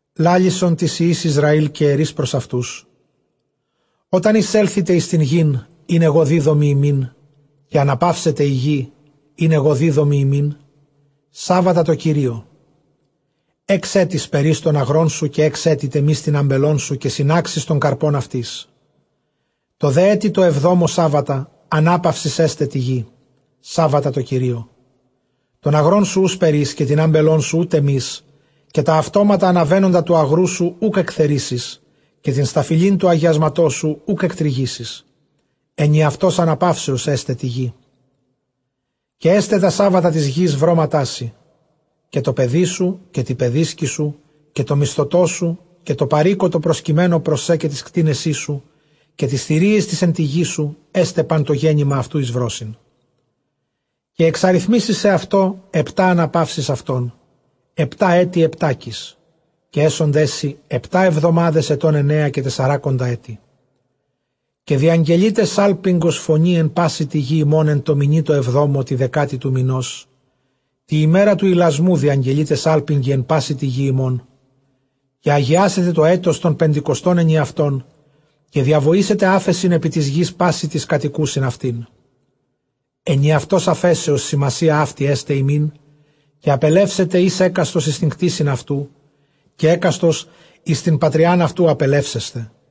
λάλησον τοῖς υἱοῖς Ἰσραὴλ, καὶ ἐρεῖς πρὸς αὐτοὺς, ὅταν εἰσέλθητε εἰς τὴν γῆν, ἣν ἐγὼ δίδωμι ὑμῖν, καὶ ἀναπαύσεται ἡ γῆ, ἣν ἐγὼ δίδωμι ὑμῖν, σάββατα τῷ Κυρίῳ. Ἓξ ἔτη σπερεῖς τὸν ἀγρόν σου, καὶ ἓξ ἔτη τεμεῖς τὴν ἄμπελόν σου, καὶ συνάξεις τὸν καρπὸν αὐτῆς. Τῷ δὲ ἔτει τῷ ἑβδόμῳ σάββατα· ἀνάπαυσις ἔσται τῇ γῇ, σάββατα τῷ Κυρίῳ· τὸν ἀγρόν σου οὐ σπερεῖς, καὶ τὴν ἄμπελόν σου οὐ τεμεῖς, καὶ τὰ αὐτόματα ἀναβαίνοντα τοῦ ἀγροῦ σου οὐκ ἐκθερίσεις, καἰ τὴν σταφυλὴν τοῦ ἁγιάσματός σου οὐκ ἐκτρυγήσεις· ἐνιαυτὸς ἀναπαύσεως ἔσται τῇ γῇ. Καὶ ἔσται τὰ σάββατα τῆς γῆς βρώματά σοι, καὶ τῷ παιδί σου, καὶ τῇ παιδίσκῃ σου, καὶ τῷ μισθωτῷ σου, καὶ τῷ παροίκῳ τῷ προσκειμένῳ πρὸς σέ. Καὶ τοῖς κτήνεσί σου, καὶ τοῖς θηρίοις τοῖς ἐν τῇ γῇ σου ἔσται πᾶν τὸ γέννημα αὐτοῦ εἰς βρῶσιν. Καὶ ἐξαριθμήσεις σεαυτῷ ἑπτὰ ἀναπαύσεις ἐτῶν, ἑπτὰ ἔτη ἑπτάκις· καὶ ἔσονταί σοι ἑπτὰ ἑβδομάδες ἐτῶν ἐννέα καὶ τεσσαράκοντα ἔτη. Διαγγελεῖτε σάλπιγγος φωνῇ ἐν πάσῃ τῇ γῇ ὑμῶν ἐν τῷ μηνὶ τῷ ἑβδόμῳ τῇ δεκάτῃ τοῦ μηνός· τῇ ἡμέρᾳ τοῦ ἱλασμοῦ διαγγελεῖτε σάλπιγγι ἐν πάσῃ τῇ γῇ ὑμῶν. Καὶ ἁγιάσετε τὸ ἔτος τὸν πεντηκοστὸν ἐνιαυτὸν, καὶ διαβοήσετε ἄφεσιν ἐπὶ τῆς γῆς πᾶσι τοῖς κατοικοῦσιν αὐτήν· ἐνιαυτὸς ἀφέσεως σημασία αὕτη ἔσται ὑμῖν· καὶ ἀπελεύσεται εἷς ἕκαστος εἰς τὴν κτῆσιν αὐτοῦ, καὶ ἕκαστος εἰς τὴν πατριὰν αὐτοῦ ἀπελεύσεσθε.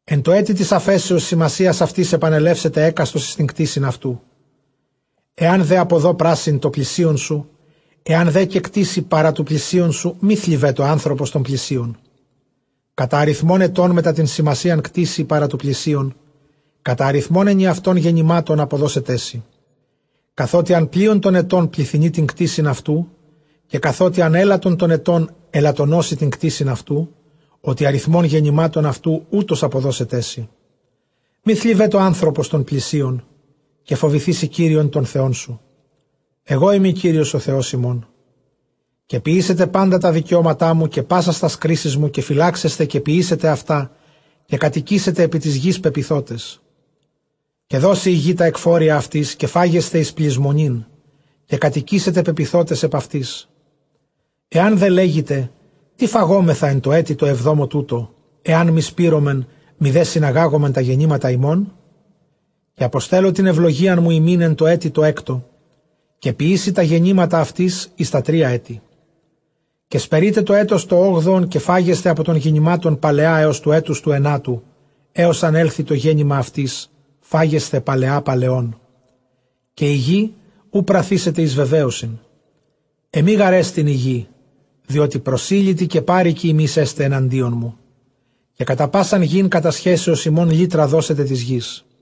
Ἐν τῷ ἔτει τῆς ἀφέσεως σημασίας αὐτῆς ἐπανελεύσεται εἰς τὴν ἔγκτησιν αὐτοῦ. Ἐὰν δὲ ἀποδῷ πράσιν τῷ πλησίον σου, ἐὰν δὲ καὶ κτήσῃ παρὰ τοῦ πλησίον σου, μὴ θλιβέτω ἄνθρωπος τὸν πλησίον. Κατὰ ἀριθμὸν ἐτῶν μετὰ τὴν σημασίαν κτήσῃ παρὰ τοῦ πλησίον, κατὰ ἀριθμὸν ἐνιαυτῶν γεννημάτων ἀποδώσεταί σοι. Καθότι ἂν πλεῖον τῶν ἐτῶν πληθυνεῖ τὴν ἔγκτησιν αὐτοῦ, καὶ καθότι ἂν ἔλαττον τῶν ἐτῶν ἐλαττονώσει τὴν ἔγκτησιν αὐτοῦ· ὅτι ἀριθμὸν γεννημάτων αὐτοῦ, οὕτως ἀποδώσεταί σοι. Μὴ θλιβέτω ἄνθρωπος τὸν πλησίον· καὶ φοβηθήσῃ Κύριον τὸν Θεόν σου· ἐγώ εἰμι Κύριος ὁ Θεὸς ὑμῶν. Καὶ ποιήσετε πάντα τὰ δικαιώματά μου, καὶ πάσας τὰς κρίσεις μου, καὶ φυλάξασθε, καὶ ποιήσετε αὐτὰ, καὶ κατοικήσετε ἐπὶ τῆς γῆς πεποιθότες. Καὶ δώσει ἡ γῆ τὰ ἐκφόρια αὐτῆς, καὶ φάγεσθε εἰς πλησμονὴν, καὶ κατοικήσετε πεποιθότες ἐπʼ αὐτῆς. Ἐὰν δὲ λέγητε, τί φαγόμεθα ἐν τῷ ἔτει τῷ ἑβδόμῳ τούτῳ, ἐὰν μὴ σπείρωμεν μηδὲ συναγάγωμεν τὰ γεννήματα ἡμῶν; Καὶ ἀποστέλλω τὴν εὐλογίαν μου ὑμῖν ἐν τῷ ἔτει τῷ ἕκτῳ, καὶ ποιήσει τὰ γεννήματα αὐτῆς εἰς τὰ τρία ἔτη. Καὶ σπερεῖτε τὸ ἔτος τὸ ὄγδοον, καὶ φάγεσθε ἀπὸ τῶν γεννημάτων παλαιὰ ἕως τοῦ ἔτους τοῦ ἐνάτου· ἕως ἂν ἔλθῃ τὸ γέννημα αὐτῆς, φάγεσθε παλαιὰ παλαιῶν. Καὶ ἡ γῆ οὐ πραθήσεται εἰς βεβαίωσιν· ἐμὴ γάρ ἐστιν ἡ γῆ, διότι προσήλυτοι καὶ πάροικοι ὑμεῖς ἐστε ἐναντίον μου. Καὶ κατὰ πᾶσαν γῆν κατασχέσεως ὑμῶν, λύτρα δώσετε τῆς γῆς.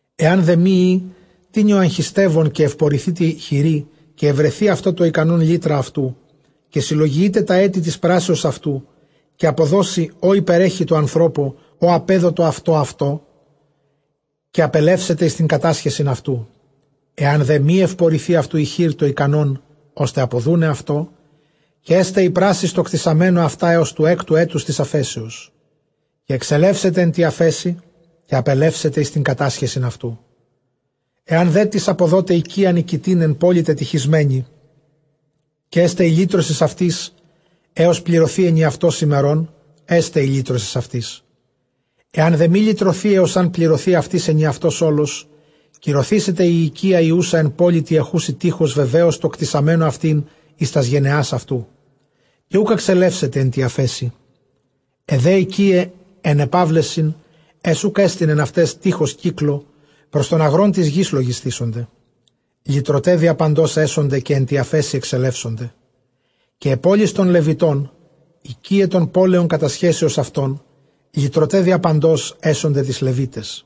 Ἐὰν δὲ μὴ ᾖ τινι ὁ ἀγχιστεύων, καὶ εὐπορηθῇ τῇ χειρὶ, καὶ εὑρεθῇ αὐτῷ τὸ ἱκανὸν, λύτρα αὐτοῦ· καὶ συλλογιεῖται τὰ ἔτη τῆς πράσεως αὐτοῦ, καὶ ἀποδώσει ὅ ὑπερέχει τῷ ἀνθρώπῳ, ᾧ ἀπέδοτο αὐτὸ αὐτῷ, καὶ ἀπελεύσεται εἰς τὴν κατάσχεσιν αὐτοῦ. Ἐὰν δὲ μὴ εὑπορηθῇ αὐτοῦ ἡ χεὶρ τὸ ἱκανὸν, ὥστε ἀποδοῦναι αὐτῷ, καὶ ἔσται ἡ πράσις τῷ κτησαμένῳ αὐτὰ ἕως τοῦ ἕκτου ἔτους τῆς ἀφέσεως, καὶ ἐξελεύσεται ἐν τῇ ἀφέσει, καὶ ἀπελεύσεται εἰς τὴν κατάσχεσιν αὐτοῦ. Ἐὰν δέ τις ἀποδῶται οἰκίαν οἰκητὴν ἐν πόλει τετειχισμένῃ, καὶ ἔσται ἡ λύτρωσις αὐτῆς, ἕως πληρωθῇ· ἐνιαυτὸς ἡμερῶν ἔσται ἡ λύτρωσις αὐτῆς. Ἐὰν δὲ μὴ λυτρωθῇ ἕως ἂν πληρωθῇ αὐτῆς ἐνιαυτὸς ὅλος, κυρωθήσεται ἡ οἰκία ἡ οὖσα ἐν πόλει τῇ ἐχούσῃ τεῖχος, βεβαίως τῷ κτησαμένῳ αὐτὴν εἰς τὰς γενεὰς αὐτοῦ, καὶ οὐκ ἐξελεύσεται ἐν τῇ ἀφέσει. Αἱ δὲ οἰκίαι αἱ ἐν ἐπαύλεσιν, αἷς οὐκ ἔστιν ἐν αὐταῖς τεῖχος κύκλῳ, πρὸς τὸν ἀγρὸν τῆς γῆς λογισθήσονται· λυτρωταὶ διαπαντὸς ἔσονται, καὶ ἐν τῇ ἀφέσει ἐξελεύσονται. Καὶ αἱ πόλεις τῶν Λευιτῶν, οἰκίαι τῶν πόλεων κατασχέσεως αὐτῶν, λυτρωταὶ διαπαντὸς ἔσονται τοῖς Λευίταις.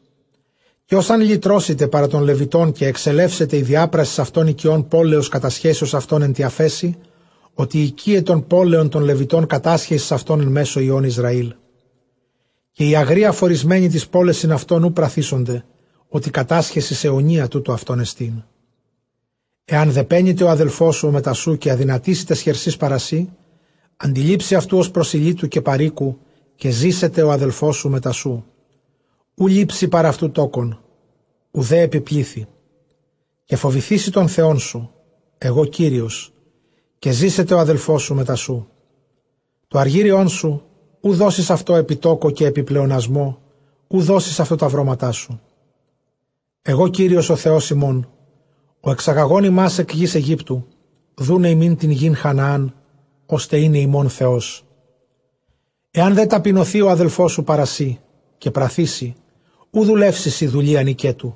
Καὶ ὃς ἂν λυτρώσηται παρὰ τῶν Λευιτῶν, καὶ ἐξελεύσεται ἡ διάπρασις αὐτῶν οἰκιῶν πόλεως κατασχέσεως αὐτῶν ἐν τῇ ἀφέσει, ὅτι οἰκίαι τῶν πόλεων τῶν Λευιτῶν κατάσχεσις αὐτῶν ἐν μέσῳ υἱῶν Ἰσραήλ. Καὶ οἱ ἀγροὶ ἀφωρισμένοι ταῖς πόλεσιν αὐτῶν οὐ πραθήσονται, ὅτι κατάσχεσις αἰωνία τοῦτο αὐτῶν ἐστον. Ἐὰν δὲ πένηται ὁ ἀδελφός σοῦ ὁ μετὰ σοῦ, καὶ ἀδυνατήσῃ ταῖς χερσὶ παρὰ σοὺ, ἀντιλήψῃ αὐτοῦ ὡς προσηλύτου καὶ παροίκου, καὶ ζήσεται ὁ ἀδελφός σου μετὰ σοῦ. Οὐ λήψῃ παρʼ αὐτοῦ τόκον, οὐδὲ ἐπὶ πλήθει· καὶ φοβηθήσῃ τὸν Θεόν σου· ἐγὼ Κύριος· καὶ ζήσεται ὁ ἀδελφός σου μετὰ σοῦ. Τὸ ἀργύριόν σου οὐ δώσεις αὐτῷ ἐπὶ τὸκῳ, καὶ ἐπὶ πλεονασμῷ οὐ δώσεις αὐτῷ τὰ βρώματά σου. Ἐγὼ Κύριος ὁ Θεὸς ὑμῶν, ὁ ἐξαγαγὼν ὑμᾶς ἐκ γῆς Αἰγύπτου, δοῦναι ὑμῖν τὴν γῆν Χαναὰν, ὥστε εἶναι ὑμῶν Θεός. Ἐὰν δὲ ταπεινωθῇ ὁ ἀδελφός σου παρὰ σοὶ, καὶ πραθῇ σοι, οὐ δουλεύσει σοι δουλείαν οἰκέτου.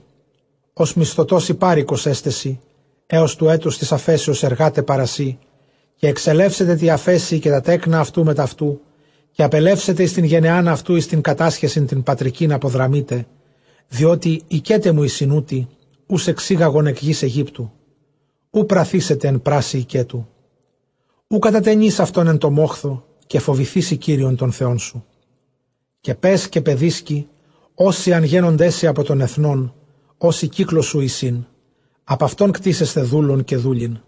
Ὡς μισθωτὸς ἢ πάροικος ἔσται σοι· ἕως τοῦ ἔτους τῆς ἀφέσεως ἐργᾶται παρὰ σοί, καὶ ἐξελεύσεται τῇ ἀφέσει, καὶ τὰ τέκνα αὐτοῦ μετʼ αὐτοῦ, καὶ ἀπελεύσεται εἰς τὴν γενεὰν αὐτοῦ, εἰς τὴν κατάσχεσιν τὴν πατρικὴν ἀποδραμεῖται. Διότι οἰκέται μου εἰσὶν οὗτοι, οὓς ἐξήγαγον ἐκ γῆς Αἰγύπτου· οὐ πραθήσεται ἐν πράσει οἰκέτου. Οὐ κατατενεῖς αὐτὸν ἐν τῷ μόχθῳ, καὶ φοβηθήσῃ Κύριον τὸν Θεόν σου, καὶ παῖς καὶ παιδίσκη ὅσοι ἂν γένωνταί σοι, ἀπὸ τῶν ἐθνῶν ὅσοι κύκλῳ σου εἰσὶν, ἀπʼ αὐτῶν κτήσεσθε δοῦλον καὶ δούλην,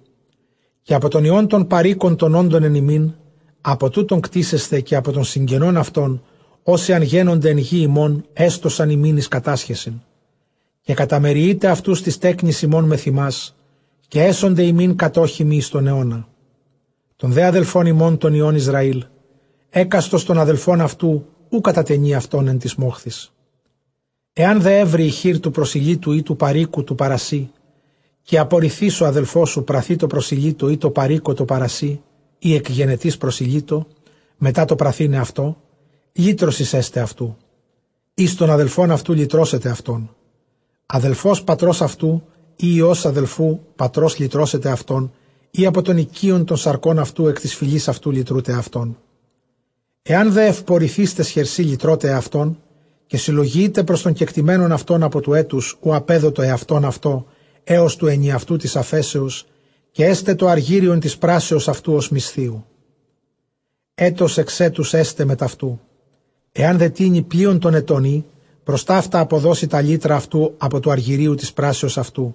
καὶ ἀπὸ τῶν υἱῶν τῶν παροίκων τῶν ὄντων ἐν ὑμῖν, ἀπὸ τούτων κτήσεσθε καὶ ἀπὸ τῶν συγγενῶν αὐτῶν, ὅσοι ἂν γένωνται ἐν τῇ γῇ ὑμῶν, ἔστωσαν ὑμῖν εἰς κατάσχεσιν. Καὶ καταμεριεῖτε αὐτοὺς τοῖς τέκνοις ὑμῶν μεθʼ ὑμᾶς· καὶ ἔσονται ὑμῖν κατόχιμοι εἰς τὸν αἰῶνα· τῶν δὲ ἀδελφῶν ὑμῶν τῶν υἱῶν Ἰσραὴλ, ἕκαστος τὸν ἀδελφὸν αὐτοῦ οὐ κατατενεῖ αὐτὸν ἐν τοῖς μόχθοις. Ἐὰν δὲ εὕρῃ ἡ χεὶρ τοὺ προσηλύτου ἢ τοῦ παροίκου τοῦ παρὰ σοὶ, καὶ ἀπορηθεὶς ὁ ἀδελφός σου πραθῇ τῷ προσηλύτῳ ἢ τῷ παροίκῳ τῷ παρὰ σοὶ, ἢ ἐκ γενετῆς προσηλύτῳ, μετὰ τὸ πραθῆναι αὐτῷ, λύτρωσις ἔσται αὐτοῦ· εἷς τῶν ἀδελφῶν αὐτοῦ λυτρώσεται αὐτόν. Ἀδελφὸς πατρὸς αὐτοῦ, ἢ υἱὸς ἀδελφοῦ πατρὸς λυτρώσεται αὐτόν, ἢ ἀπὸ τῶν οἰκείων τῶν σαρκῶν αὐτοῦ ἐκ τῆς φυλῆς αὐτοῦ λυτρῶται αὐτόν· ἐὰν δὲ εὐπορηθεὶς ταῖς χερσὶ λυτρῶται ἑαυτὸν, καὶ συλλογιεῖται πρὸς τὸν κεκτημένον αὐτὸν ἀπὸ τοῦ ἔτους οὗ ἀπέδοτο ἑαυτὸν αὐτῷ ἕως τοῦ ἐνιαυτοῦ τῆς ἀφέσεως· καὶ ἔσται τὸ ἀργύριον τῆς πράσεως αὐτοῦ ὡς μισθίου· ἔτος ἐξ ἔτους ἔσται μετʼ αὐτοῦ. Ἐὰν δέ τινι πλεῖον τῶν ἐτῶν ᾖ, πρὸς ταῦτα ἀποδώσει τὰ λύτρα αὐτοῦ ἀπὸ τοῦ ἀργυρίου τῆς πράσεως αὐτοῦ.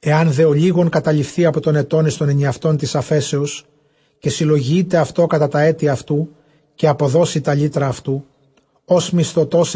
Ἐὰν δὲ ὀλίγον καταλειφθῇ ἀπὸ τῶν ἐτῶν εἰς τὸν ἐνιαυτὸν τῆς ἀφέσεως, καὶ συλλογιεῖται αὐτῷ κατὰ τὰ ἔτη αὐτοῦ, καὶ ἀποδώσει τὰ λύτρα αὐτοῦ ὡς μισθωτός·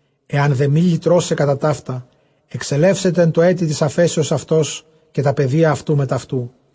Ἐὰν δὲ μὴ λυτρῶται κατὰ ταῦτα, ἐξελεύσεται ἐν τῷ ἔτει τῆς ἀφέσεως αὐτὸς καὶ τὰ παιδία αὐτοῦ μετʼ αὐτοῦ.